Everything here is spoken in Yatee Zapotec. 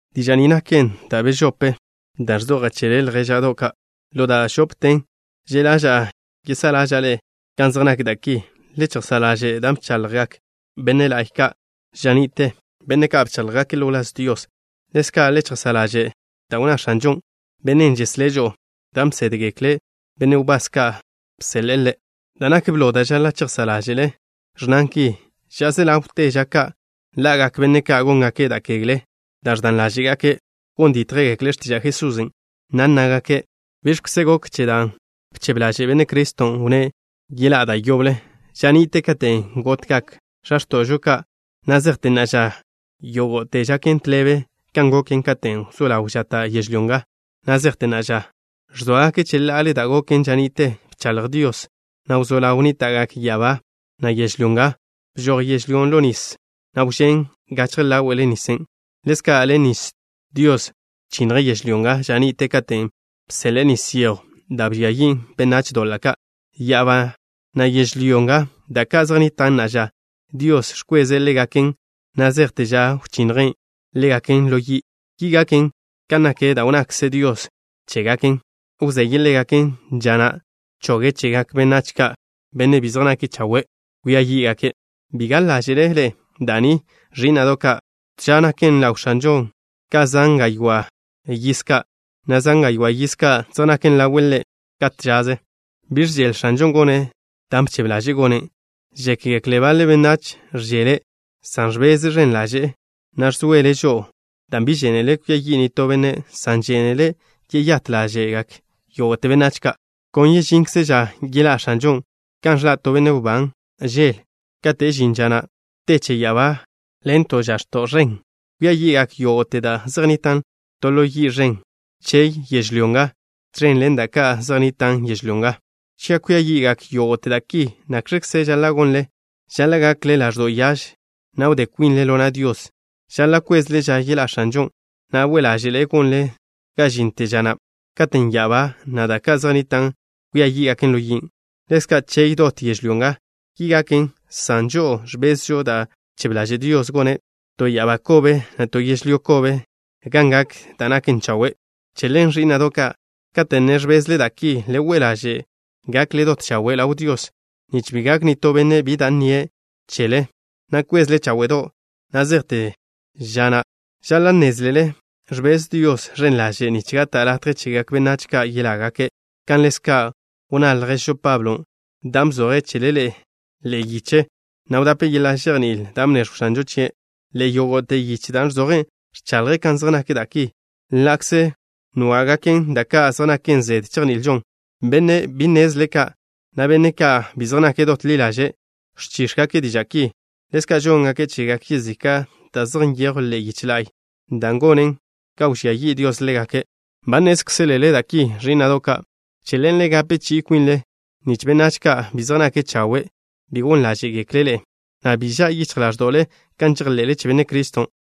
Diža' ni naken da' bežopen' da' ẕzojan' chele, ljéža'do' ka'. Ḻo da' žópeten že' ḻaža'a yesá'a ḻáže'le kan zej nak da' ki. Le chejsá' ḻaže' da' bchaḻjgak benne' la'y ka' ža ni'te, benne' ka' bcháḻjgake' ḻo wláz Dios. Ḻezka' le chejsá' ḻaže' da' wnná X̱anžon', Bennen' žeslé' žo'o, dan' bsédgekle benne' wbás ka' bseḻe'e Ḻe'. Da' nak blo da' žaḻa' chejsá' ḻáže'le, ẕnnan ki: “Ža se ḻawte ža ka' ḻa'gak benne' ka' góngake' da' kegle dan' ẕdan ḻáže'gake'.” Gon dítjgekle' x̱tiža' Jesusen', na' nnágake': “¿Biẕkze gok che dan' bchebe ḻaže' Benne' Criston'? Wnné': Yeḻá'a da' yoble. Ža ni'te katen' gotgak x̱a x̱to'žo ka', na' zejte na'a ža, yógo'te žaken tḻebe kan goken katen' wzó ḻaw žata' yežlyó nga na' zejte na'a ža.” Ẕzóagake' cheḻa'ale da' goken ža ni'te. Bchaḻj Dios, na' wzó ḻaw nníta'gak ya'abá, na' yežlyó nga. Bžoj yežlyón' ḻo nis, na' wžén' gachje ḻáwe'le nisen'. Ḻezka' ḻen nis Dios bchinnje' yežlyó nga ža ni'te katen' bseḻe'e nis yejw da' bžia yin' benách doḻa' ka'. Ya'abá, na' yežlyó nga, da' ka' zej nnitan' na'a ža, Dios ẕkweze' ḻégaken na' zejte ža wchinnje' ḻégaken ḻo yi'. Ki gaken, kan nak da' wnnakze Dios chégaken. Wzeye' ḻégaken ža na' choge' chegak benách ka', benne' bi zej nake' chawe', kwia yí'gake'. Bi gaḻ ḻáže'le ḻe'e da' ni, ẕí'na'do' ka'. To ža naken ḻaw X̱anžon' ka zan gaywá' yiz ka', na' zan gaywá' yiz ka' zej naken ḻawe' Ḻe' ka to žaze. Bi ẕžele X̱anžon' gone' da' bchebe ḻaže'e gone'. Žékgekle baḻe benách ẕžele', san ẕbeze' ẕen ḻaže', na' ẕzoele' žo'o dan' bi žénele' kwia yi' nitó benne', san žénele' yeyát ḻáže'gak yógo'te benách ka'. Kon yežinkze ža yeḻá' X̱anžon' kan ẕḻa' to benne' wbán žel. Kate' žin ža na' te che ya'abá ḻen to žax̱to' ẕen. Kwia yi'gak yógo'te da' zej nnitan' to ḻo yi' ẕen. Chey yežlyó nga, tẕen ḻen da' ka' zej nnitan' yežlyó nga. Cha' kwia yi'gak yógo'te da' ki, ¿nakx̱kze žaḻa' gonle? Žaḻa' gakle ḻaẕdo' yaž, na' wdé kwinle ḻo na' Dios. Žaḻa' kwezle ža yeḻá' X̱anžon', na' we' ḻáže'le gonle ga žinte ža na' katen' ya'abá, na' da' ka' zej nnita' kwia yí'gaken ḻo yin'. Ḻezka' chey dot yežlyó nga. Ki gaken, san žo'o ẕbezžo da' bchebe ḻaže' Dios, gone' to ya'abá kobe, na' to yežlyó kobe gan gak da' naken chawe'. Che ḻen, ẕí'na'do' ka', kate' ne ẕbezle da' ki, le we' ḻaže' gakle dot chawe' ḻaw Dios, nich bi gak nitó benne' bi da' nnie' chele, na' kwezle cháwe'do' na' zejte ža na'. Žaḻa' nnézlele ẕbez Dios ẕen ḻaže' nich gata' latje chegak benách ka' yelágake', kan ḻezka' wnná lježžo Pablo, dan' bzoje' chele ḻe'e yiche, na' wdape' yeḻa' žejní'il da' bneẕjw X̱anžon' chie'. Ḻe'e yógo'te yiche da' ẕzoje', ẕchaḻje' kan zej nak da' ki, ḻa'kze nwá'gaken da' ka' zej naken zede chejni'ilžon. Benne' bi nnezle ka', na' benne' ka' bi zej nake' dot ḻi ḻaže', ẕchíx̱gake' diža' ki. Ḻezka' žóngake' chegak yezika' da' zej nyejwn ḻe'e yiche la'y, dan' gonen ga wžía yi' Dios ḻégake'. Ba nnézkzelele da' ki, ẕí'na'do' ka'. Che ḻen le gape chi'i kwinle, nich benách ka' bi zej nake' chawe' bi gon ḻáže'gekle' ḻe'e, na' bi ža' yichj ḻáẕdo'le kan žejḻe'le che Benne' Criston'.